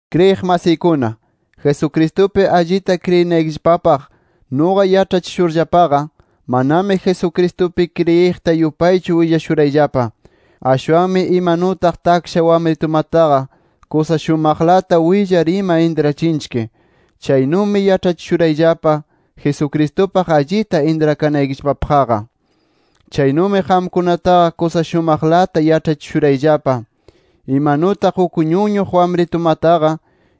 Kriyiq masiykuna, Jesucristupi allita kriyinaykillapapaq nuqa yaĉhachishurllapaqa, manami Jesucristupi kriyiqta yupaychu willashurayllapa. Ashwanmi imanutaq taksha wamritumataqa kusa shumaqlata willar ima intrachinchik, chaynumi yaĉhachishurayllapa Jesucristupaq allita intrakanaykillapapaqqa. Chaynumi qamkunataqa kusa shumaqlata yaĉhachishurayllapa, imanutaq uk ñuñuq wamritumataqa,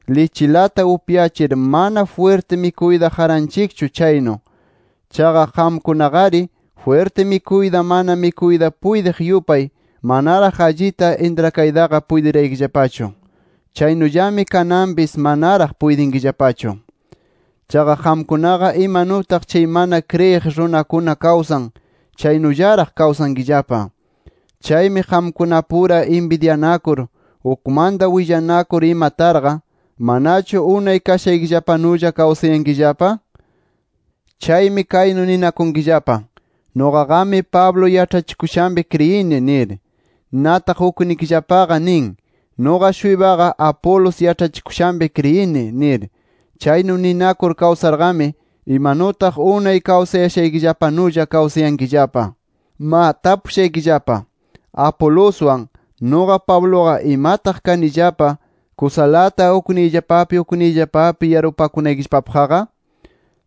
lichilata upyachir mana jwirti mikuyta qaranchikchu chaynu. Chaqa qamkunaqari, jwirti mikuyta mana mikuyta puytiq yupay, manaraq allita intrakaytaqa puytiraykillapachu. ¡Chaynullami kananmapis manaraq puytinkillapachu! ¡Chaqa qamkunaqa imanutaq chay mana kriyiq runakuna kawsan, chaynullaraq kawsankillapa! Chaymi qamkunapura inbidyanakur, ukmanta willanakur ima tarqa ¿manachu unay kashaykillapanulla kawsayankillapa? Chaymi kaynu ninakunkillapa: “Nuqaqami Pablo yaĉhachikushanpi kriyini” nir. Nataq uknikillapaqa nin: “Nuqa-shuypaqa Apolos yaĉhachikushanpi kriyini” nir. Chaynu ninakur kawsarqami, imanutaq unay kawsayashaykillapanulla kawsayankillapa. Ma tapushaykillapa: ¿Apoloswan, nuqa Pabluqa imataq kanillapa kusalata ukniyllapapi ukniyllapapi yarpupakunaykillapapaqqa?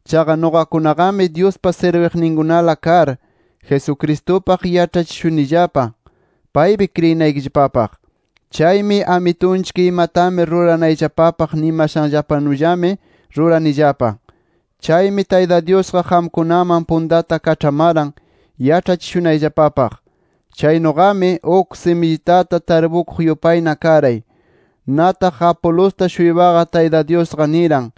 Chaqa nuqakunaqami Dyuspa sirbikuqninkunala kar, Jesucristupaq yaĉhachishunillapa paypi kriyinaykillapapaq. Chaymi Amitunchik imatami ruranayllapapaq nimashanllapanullami ruranillapa. Chaymi Tayta Dyusqa qamkunaman puntata kaĉhamaran yaĉhachishunayllapapaq. Chaynuqami, uk simillitata tarpukuq yupayna karay. Nataq Apolosta-shuypaqa Tayta Dyusqa niran,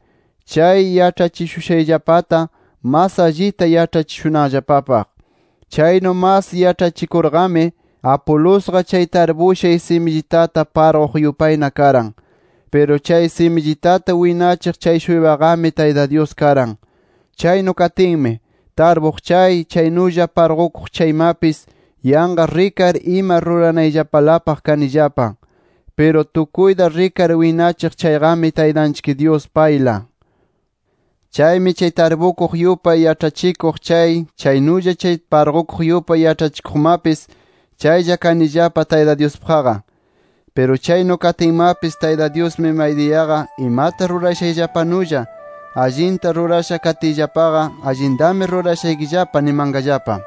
chay yaĉhachishushayllapata mas allita yaĉhachishunanllapapaq. Chaynu mas yaĉhachikurqami Apolosqa chay tarpushay simillitata parquq yupayna karan. Piru chay simillitata winachiq chay-shuypaqami Tayta Dyus karan. Chaynu katinmi, tarpuq chay, chaynulla parqukuq chaymapis yanqa rikar ima ruranayllapalapaq kanillapa. Piru tukuyta rikar winachiq chayqami Taytanchik Dyus payla. Chaymi chay tarpukuq yupay yaĉhachikuq chay, chaynulla chay parqukuq yupay yaĉhachikuqmapis, chaylla kanillapa Tayta Dyuspaqqa. Piru chaynu katinmapis Tayta Dyusmi maydiyaqa imata rurashayllapanulla, allinta rurasha katiyllapaqa, allintami rurashaykillapa nimanqallapa.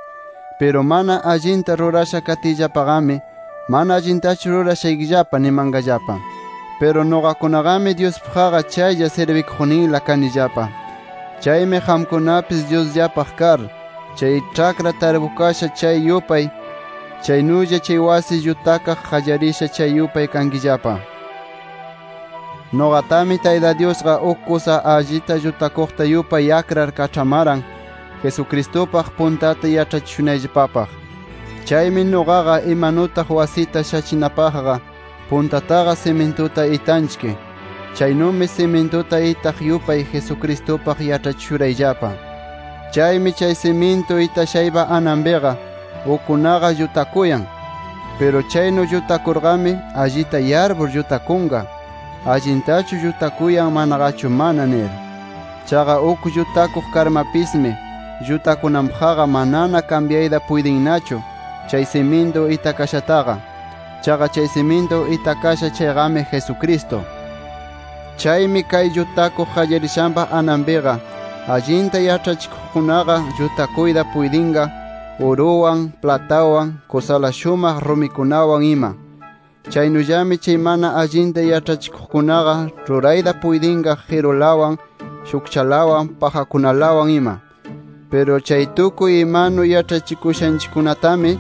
Piru mana allinta rurasha katiyllapaqami, mana allintachu rurashaykillapa nimanqallapa. Piru nuqakunaqami Dyuspaqqa chaylla sirbikuqninla kanillapa. Chaymi qamkunapis Dyusllapaq kar, chay ĉhakra tarpukasha chay yupay, chaynulla chay wasi llutakaq qallarisha chay yupay kankillapa. Nuqatami, Tayta Dyusqa uk kusa allita llutakuqta yupay akrar kaĉhamaran, Jesucristupaq puntata yaĉhachishunayllapapaq. Chaymi nuqaqa imanutaq wasita shachinapaqqa puntataqa simintuta itanchik, chaynumi simintuta itaq yupay Jesucristupaq yaĉhachishurayllapa. Chaymi chay simintu itashaypa ananpina ukkunaqa llutakuyan. Piru chaynu llutakurqami, allita yarpur llutakunqa, allintachu llutakuyan manaqachu mana nir. Chaqa uk llutakuq karmapismi, llutakunanpaqqa manana kambyayta puytinnachu chay simintu itakashataqa. Chaqa chay simintu itakasha chayqami, Jesucristo. Chaymi kay llutakuq qallarishanpa ananpiqa, allinta yaĉhachikuqkunaqa llutakuyta puytinqa uruwan, platawan, kusala shumaq rumikunawan ima. Chaynullami chay mana allinta yaĉhachikuqkunaqa rurayta puytinqa qirulawan, shukchalawan, pajakunalawan ima. Piru chay tukuy imanu yaĉhachikushanchikkunatami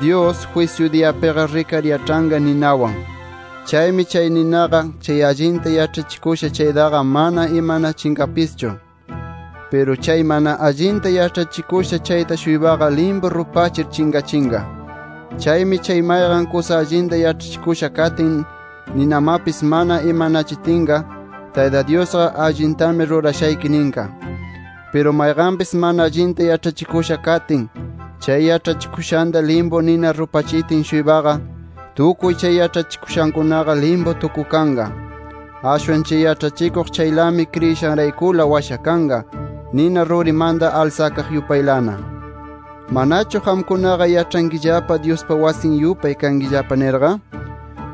Dyus, jwisyu diyapiqa rikar yaĉhanqa ninawan. Chaymi chay ninaqa chay allinta yaĉhachikusha chaytaqa mana imanachinqapischu. Piru chay mana allinta yaĉhachikusha chayta-shuypaqa limpu rupachir chinqachinqa. Chaymi chay mayqan kusa allinta yaĉhachikusha katin, ninamapis mana imanachitinqa, Tayta Dyusqa allintami rurashayki ninqa. Piru mayqanpis mana allinta yaĉhachikusha katin, chay yaĉhachikushanta limpu nina rupachitin-shuypaqa, tukuy chay yaĉhachikushankunaqa limpu tukukanqa. Ashwan chay yaĉhachikuq chaylami kriyishanraykula washakanqa nina rurimanta alsakaq yupaylana. ¿Manachu qamkunaqa yaĉhankillapa Dyuspa wasin yupay kankillapa nirqa?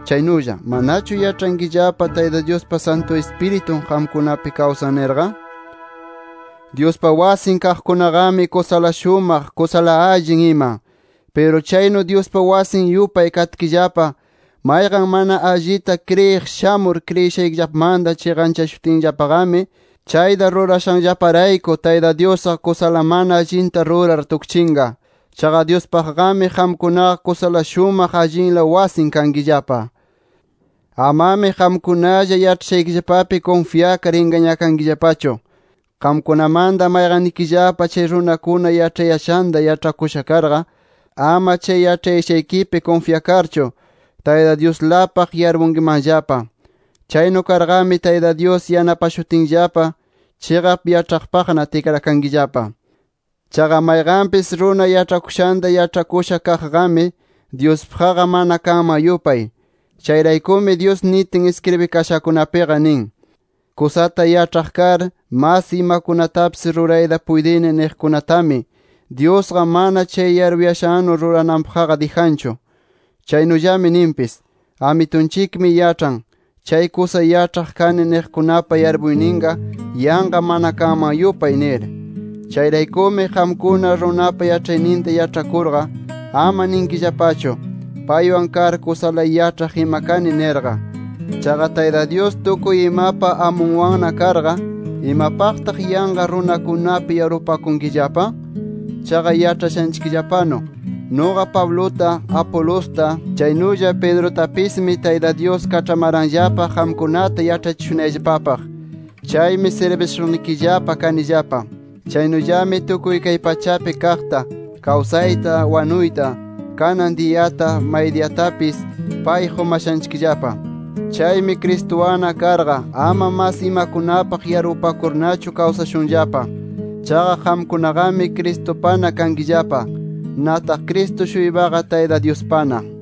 Chaynulla ¿manachu yaĉhankillapa Tayta Dyuspa Santu Ispiritun qamkunapi kawsan nirqa? Dyuspa wasin kaqkunaqami, kusala shumaq, kusala allin ima. Piru chaynu, Dyuspa wasin yupay katkillapa, mayqan mana allita kriyiq shamur, kriyishaykillapamanta chiqanchashutinllapaqami, chayta rurashanllaparayku Tayta Dyusqa kusala mana allinta rurar tukchinqa. Chaqa Dyuspaqqami qamkunaqa kusala shumaq allinla wasin kankillapa. Amami qamkunalla yaĉhayashaykipi kunfyakar ingañakankillapachu. Qamkunamanta mayqannikillapa chay runakuna yaĉhayashanta yaĉhakusha karqa, ama chay yaĉhayashaykipi kunfyakarchu, Tayta Dyuslapaq yarpunkimanllapa. Chaynu karqami Tayta Dyus yanapashutinllapa chiqap yaĉhaqpaqna tikrakankillapa. Chaqa mayqanpis runa yaĉhayashanta yaĉhakusha kaqqami Dyuspaqqa mana kanman yupay. Chayraykumi Dyus nitin iskribikashakunapiqa nin: “Kusata yaĉhaq kar, mas imakunatapis rurayta puytini niqkunatami, Dyusqa mana chay yarpuyashannu rurananpaqqa dijanchu”. Chaynullami ninpis: “Amitunchikmi yaĉhan, chay kusa yaĉhaq kani niqkunapa yarpuyninqa yanqa mana kanman yupay” nir. Chayraykumi, qamkuna runapa yaĉhayninta yaĉhakurqa, ama ninkillapachu, paywan kar kusala yaĉhaq ima kani nirqa. Chaqa Tayta Dyus tukuy imapa amunwanna karqa, ¿imapaqta yanqa runakunapi yarpupakunkillapa? Chaqa yaĉhashanchikllapanu nuqa Pabluta, Apolosta, chaynulla Pedrutapismi Tayta Dyus kaĉhamaranllapa qamkunata yaĉhachishunayllapapaq. Chaymi sirbishuqnikillapa kanillapa. Chaynullami tukuy kay pachapi kaqta, kawsayta, wanuyta, kanan diyata, maydiyatapis pay qumashanchikllapa. Chaymi Cristuwanna karqa ama mas imakunapaq yarpupakurnachu kawsashunllapa. Chaqa qamkunaqami Cristupana kankillapa. Nataq Cristo-shuypaqa Tayta Dyuspana.